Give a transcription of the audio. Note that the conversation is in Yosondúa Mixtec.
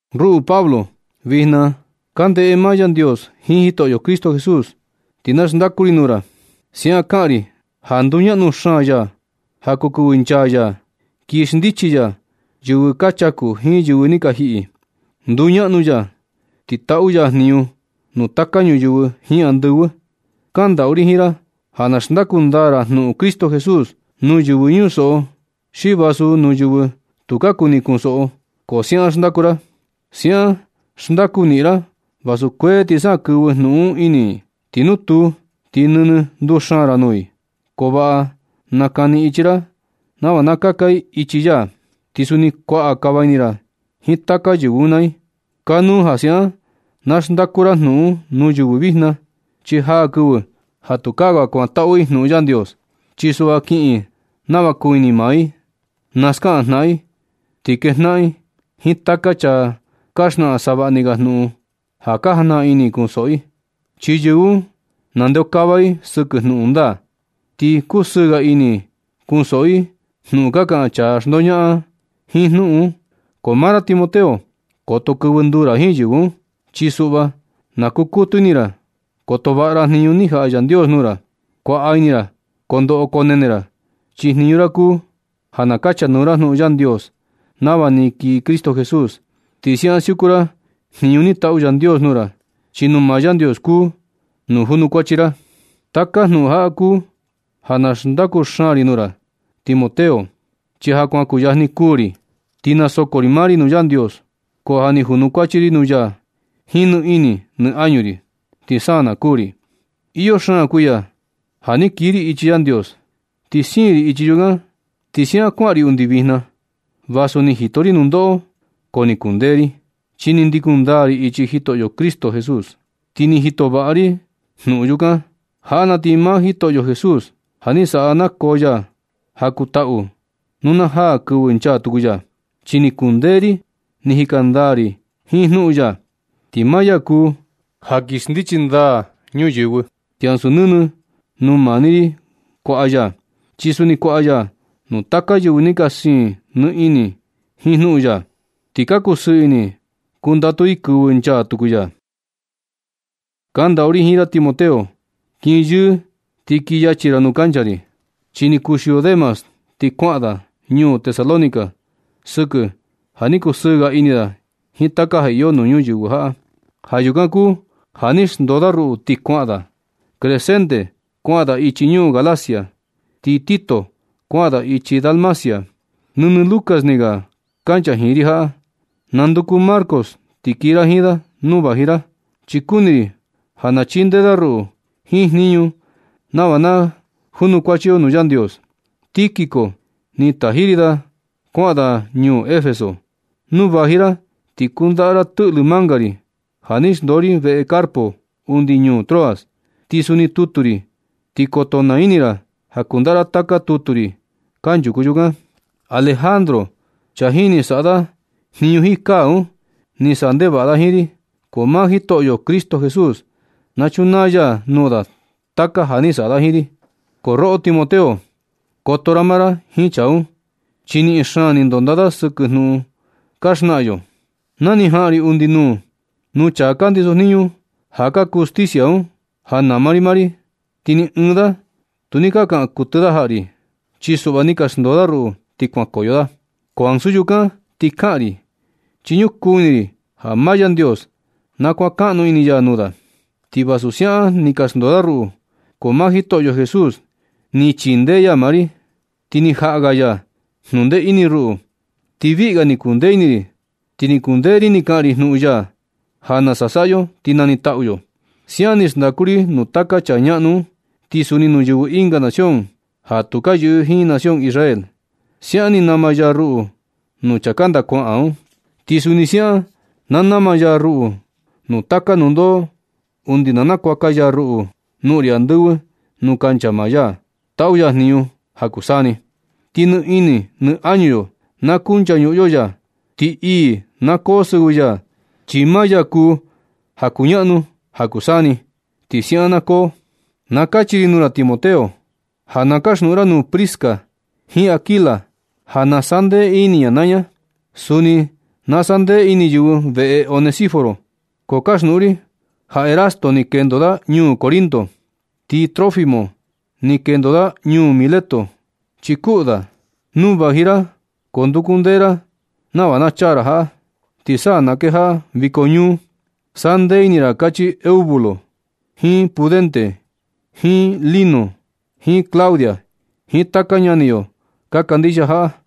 Ruꞌu Pablo, vijna ka ndeꞌe maa Yandios jiin Jitoꞌo Cristo Jesús, ti na xndaku ri nuu ra. Siaꞌan kaꞌan ri chi ja nduñaꞌnu xaan ya ja kuu kɨvɨ nchaa ya kii xndichi ya yɨvɨ ka chaku jiin yɨvɨ ni ka jiꞌi. Nduñaꞌnu ya, ti taꞌu ya jniñu nuu taka ñuyɨvɨ jiin andɨvɨ. Kandaꞌu ri jiin ra ja na xndaku ndaa ra jnuꞌun Cristo Jesús nuu yɨvɨ chunsoꞌo, xi vasu nuu yɨvɨ tu ka kuni kunsoꞌo, ko siaꞌan xndaku ra. Siaꞌan xndaku niꞌin ra vasu kuee ti sa na kɨvɨ jnuꞌun un ini i. Ti nu tuu, ti nɨnɨ nduxaan ra nuu i. Ko vaꞌa nakani ichi ra nava kaka i ichi ya, ti suni kuaꞌa kava ini ra jiin taka yɨvɨ un naa i. Kanu ja siaꞌan na xndaku ra jnuꞌun un nuu yɨvɨ vijna, chi jaa kɨvɨ ja tukaa ga kuantaꞌu i jnuꞌun Yandios. Chi suꞌva kiꞌin i nava ka kuu ini maa i, naskaꞌan jnaꞌan i, ti kejnaꞌan i jiin taka chaa ka xnaꞌan savaꞌni ga jnuꞌun ja ka jajnaꞌan ini i kunsoꞌo i. Chi yɨvɨ un nandeokava i sɨkɨ jnuꞌun ndaa, ti kusɨɨ ga ini i kunsoꞌo i jnuꞌun ka kaꞌan chaa ka xndoñaꞌan jiin jnuꞌun. Ko maa ra Timoteo, koto kɨvɨ nduu ra jiin yɨvɨ un. Chi suꞌva na kukutu ini ra koto vaꞌa ra jniñu ni jaꞌa Yandios nuu ra. Kuaꞌa ini ra kondoꞌo konene ra, chi jniñu ra kuu ja na kachanuu ra jnuꞌun Yandios nava ni kii Cristo Jesús. Ti siaꞌan siuku ra jniñu ni taꞌu Yandios nuu ra, chi nuu maa Yandios kuu nu junukuachi ra. Taka jnuꞌun jaꞌa kuu ja na xndaku xaan ri nuu ra Timoteo, chi ja kuan kuyajni kuū ri. Ti nasoko ri maa ri nuu Yandios, ko ja ni junukuachi ri nuu ya jiin nɨ ini nɨ añu ri, ti sa na kuū ri. Iyo xaan kuiya ja ni kiꞌin ri ichi Yandios. Ni siin ri ichi yukan ti siaꞌan kuaꞌan ri undi vijna. Vasu ni jito ri nundoꞌo ko ni kundee ri, chi ni ndikun ndaa ri ichi Jitoꞌo Jesús, ti ni jito vaꞌa ri jnuꞌun yukan. Jaꞌa na ti maa Jitoꞌo Jesús ja ni saꞌa nakoo ya ja kuu taꞌu nuu na jaa kɨvɨ nchaa tuku ya, chi ni kundee ri ni jika ndaa ri jiin jnuꞌun ya, ti maa ya kuu ja kii xndichi ndaa ñuyɨvɨ. Ti ansu nɨnɨ nuu maa ni ri kuaꞌa ya, chi suni kuaꞌa ya nuu taka yɨvɨ ni ka siin nɨ ini jiin jnuꞌun ya. Ti ka kusɨɨ ini i kundatu i kɨvɨ nchaa tuku ya. Kandaꞌu ri jiin ra Timoteo, kin yɨɨ ti kii yachi ra nuu kancha ri. Chi ni kuxio Demas ti kuaꞌan da ñuu Tesalónica sɨkɨ ja ni kusɨɨ ga ini da jiin taka ja iyo nuu ñuyɨvɨ jaꞌa. Ja yukan kuu ja ni xndoo da ruꞌu ti kuaꞌan da. Crescente kuaꞌan da ichi ñuu Galacia, ti Tito kuaꞌan da ichi Dalmacia. Nɨnɨ Lucas ni ga kancha jiin ri jaꞌa. Nanduku Marcos ti kii ra jiin da nu vaji ra, chi kuni ri ja na chindee da ruꞌu jiin jniñu nava ka junukuachi yo nuu Yandios. Tíquico ni taji ri da kuaꞌan da ñuu Efeso. Nu vaji ra ti kundaꞌa tɨꞌlɨ manga ri ja ni xndoo ri veꞌe Carpo undi ñuu Troas. Ti suni tutu ri, ti koto naa ini ra ja kundaꞌa ra taka tutu ri kanchuku yukan. Alejandro, chaa jini saꞌa da jniñu jiin kaa un, ni saꞌa ndevaꞌa da jiin ri, ko maa Jitoꞌo Cristo Jesús na chunaa ya nuu da taka ja ni saꞌa da jiin ri. Ko roꞌo Timoteo, koto ra maa ra jiin chaa un, chi niꞌin xaan ni ndonda da sɨkɨ jnuꞌun ka xnaꞌan yo. Na ni jaꞌan ri undi nuu nuu chaa ka ndisojniñu ja ka kuu justicia un ja nama ri maa ri, ti ni ɨɨn da tu ni ka kaꞌan kuɨtɨ jaꞌa ri, chi suꞌva ni ka xndoo da ruꞌu ti kuankoyo da. Ko ansu yukan ti kaꞌan ri, chi ñukuu ini ri ja maa Yandios na kuankaꞌnu ini ya nuu da. Ti vasu siaꞌan ni ka xndoo da ruꞌu, ko maa Jitoꞌo Jesús ni chindee ya maa ri, ti ni jaꞌa ga ya jnuꞌun ndee ini ruꞌu, ti viꞌi ga ni kuu ndee ini ri, ti ni kundee ri ni kaꞌan ri jnuꞌun ya ja nasa saꞌa yo ti nanitaꞌu yo. Siaꞌan ni xndaku ri nuu taka chaa ñaꞌnu un, ti suni nuu yɨvɨ ɨnga nación ja tu ka yɨꞌɨ jiin nación Israel. Siaꞌan ni nama ya ruꞌu nuu chaa kanda kuaꞌan un. Ti suni siaꞌan na nama ya ruꞌu nuu taka nundoꞌo undi na nakuaka ya ruꞌu noꞌon ri andɨvɨ nuu kancha maa ya taꞌu ya jniñu ja kuu saa ni. Ti nɨ ini nɨ añu yo na kunchañuꞌun yo ya. Ti ii na koo sɨvɨ ya, chi maa ya kuu ja kuñaꞌnu ja kuu saa ni. Ti siaꞌan na koo. Na kachi ri nuu ra Timoteo, ja na kaxnuꞌun ra nuu Prisca jiin Aquila ja na sandee ini ña naa ña. Suni na sandee ini yɨvɨ veꞌe Onesíforo. Ko kaxnuꞌun ri ja Erasto ni kendo da ñuu Corinto. Ti Trófimo ni kendo da ñuu Mileto chi kuꞌu da. Nu vaji ra ko ndukundee ra nava ja chaa ra jaꞌa, ti sa na kejaꞌa viko ñuu. Sandee ini ra, kachi Eubulo, jiin Pudente, jiin Lino, jiin Claudia, jiin taka ñani yo ka kandixia jaꞌa.